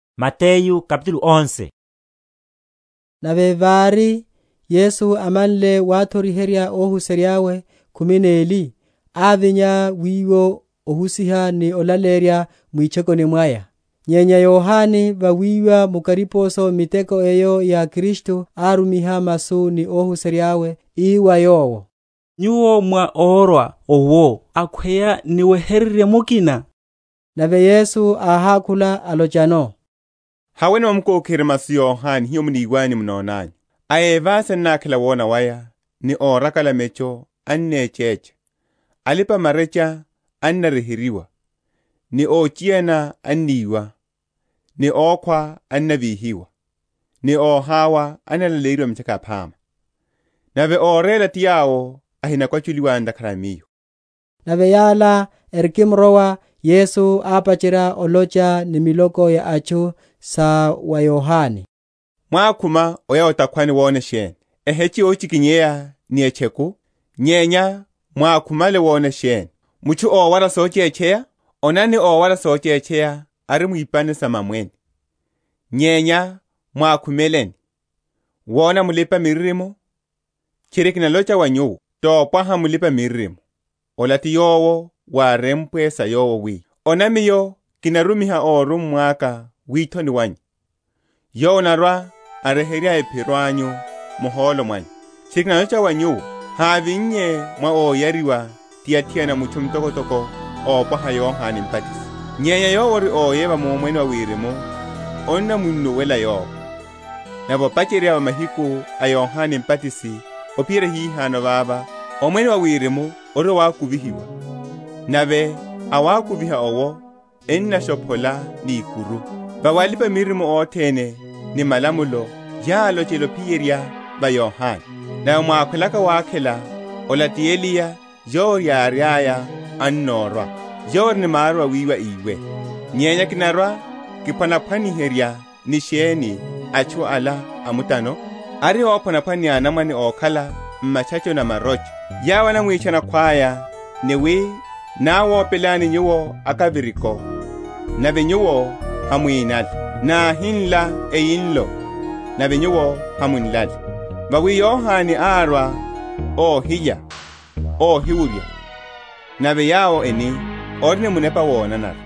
Órumiwa ti Yohane Mbatisi. Nave vári, Yesu amanle wathoriherya óhuserya’we khumi neli, ávinya wiwo ohusiha ni olaleyerya mwitchokoni mwaya. Nyenya Yohane, vawiwa mu kariposo miteko eyo ya Kristu, árumiha masu ni ohuserya’we, ii wa Yowo, Nyuwo mwá órwa owo, akhweya niwehererye mukina? Nave Yesu áhákhula, alochano, Haweni mukokiherye masu wa Yohane hiho muniwanyu ni munonanyu: A evasi ennakhela wona waya, ni órakala mecho ennechecha, alipa‐marecha ennaryeheryiwa, ni óchiyana enniwa, ni ókhwa ennavíhiwa, ni wa óhawa ennalaleyeryiwa mitchaka yaphama. Nave óréla ti yowo ahinakwachuliwa ntakhara a Miyo. Nave yala erikimrowa, Yesu ápacherya olocha ni miloko ya atchu sa wa Yohane, Mwákhuma oya o’takhwani wona sheni? Eheche yochikinyeya ni etcheku? Nyenya mwákhumale wona sheni? Mutchu ówara sochetcheya? Onani, ówara sochetcheya ari mu ipani sa mamwene. Nyenya mwákhumeleni? Wona mulipa‐miririmo? Tchiri, kinalocha wa nyuwo, topwaha mulipa‐miririmo. Ola ti yowo wárempwe sa yowo, wi, Ona Miyo kinarumiha órummwa aka withoni wanyu, Yowo anarwa‐aryeherya ephiro anyu muholo mwanyu. Tchiri kinalocha wa nyuwo, Hávinnye mwa óyariwa ti athiana mutchu mtokotoko ópwaha Yohane Mbatisi; nyenya yowo ori óyeva mu Omwene wa Wirimu annamunnuwela yowo. Nave opacherya va mahiku a Yohane Mbatisi, ophiyerya hihano vava, Omwene wa Wirimu ori wawakuvihiwa, nave awakuviha’wo ennashophola ni ikuru. Vawi alipa‐miririmo othene ni malamulo yálochela ophiyerya va Yohane. Nave mwákhwelaka wakhela, ola ti Eliya yowo yiriaya annórwa. Yowo ori ni maru awiwa, íwe. Nyenya kinarwa‐kiphwanaphwaniherya ni sheni atchu ala a mutano? Ari óphwanaphwana ni anamwane ókhala m’matchachoni a marocha, yawo enamwitchana akhwaya, ni wi, Náwopelani nyuwo akaviriko, nave nyuwo hamwínale; nahinla eyinlo, nave nyuwo hamwánlale. Vawi Yohane árwa óhilya, óhiwurya, nave yawo eni, Ori ni munepa wonanara.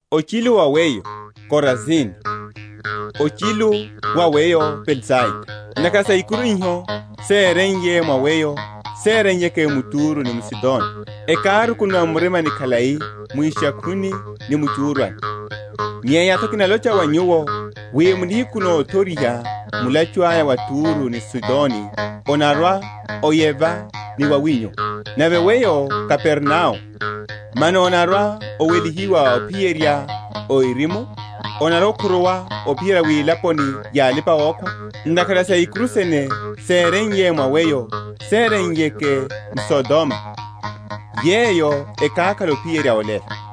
Ochilu wa weyo, Korazini! ochilu wa weyo Betsaida! Ntakhara saikuru iho séreiye mwa weyo séreiyeke m’Turo ni m’Sidoni, ekárukunuwa m’murima khalai mu ishakhwini ni mu echúrwani. Nyenya’tho kinalocha wa nyuwo wi mu nihiku nothoriha mulachu aya wa Turo ni Sidoni onarwa‐oyeva ni wawinyu. Nave weyo, Kapernao, mano onarwa‐owelihiwa ophiyerya o erimu? onarwa‐okhuruwa ophiyerya wilaponi ya alipa‐okhwa! ntakhara saikuru sene séreiye mwa weyo séreiyeke m’Sodoma, yeyo ekákhala ophiyerya olelo.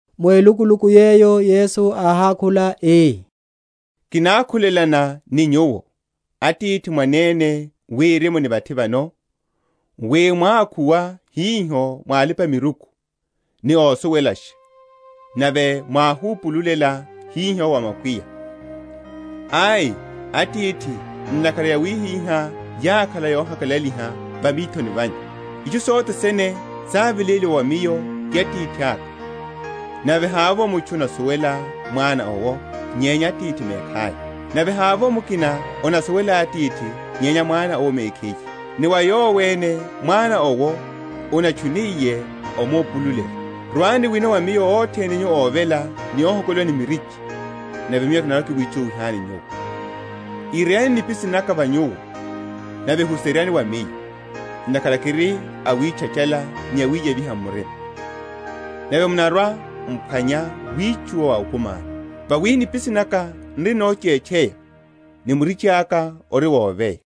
Mu elukuluku yeyo Yesu áhákhula ii, Kinákhulelana ni Nyuwo, Atithi, Mwanene Wirimu ni vathi vano, wi mwákhuwa hiho wa alipa‐miruku ni ósuwelasha, nave mwáhupululela hiho wa makwiya. Ai, Atithi, ntakhara yawihihá yákhala yohakalaliha va mithoni vanyu. Itchu sothene sáveléliwa wa Miyo ti Atithaka; nave hávovo mutchu anasuwela Mwana owo, nyenya Atithi mekhaya; nave hávovo mukina anasuwela Atithi nyenya Mwana owo mekhiye, ni wa yowo ene Mwana owo anatchuniye omupululela. Rwani wino wa Miyo othene nyu óvela ni óhokoliwa ni mirichi, nave Miyo kinarwa‐kiwitchuwihani nyuwo. Ireyani nipisi naka va nyuwo, nave huseryani wa Miyo; ntakhara kiri awitchachála ni awiyeviha m’murima: nave munarwa‐m’phwanya witchuwa wa okumi anyu. Vawi nipisi naka n’ri nochetcheya, ni murichi aka ori woveya.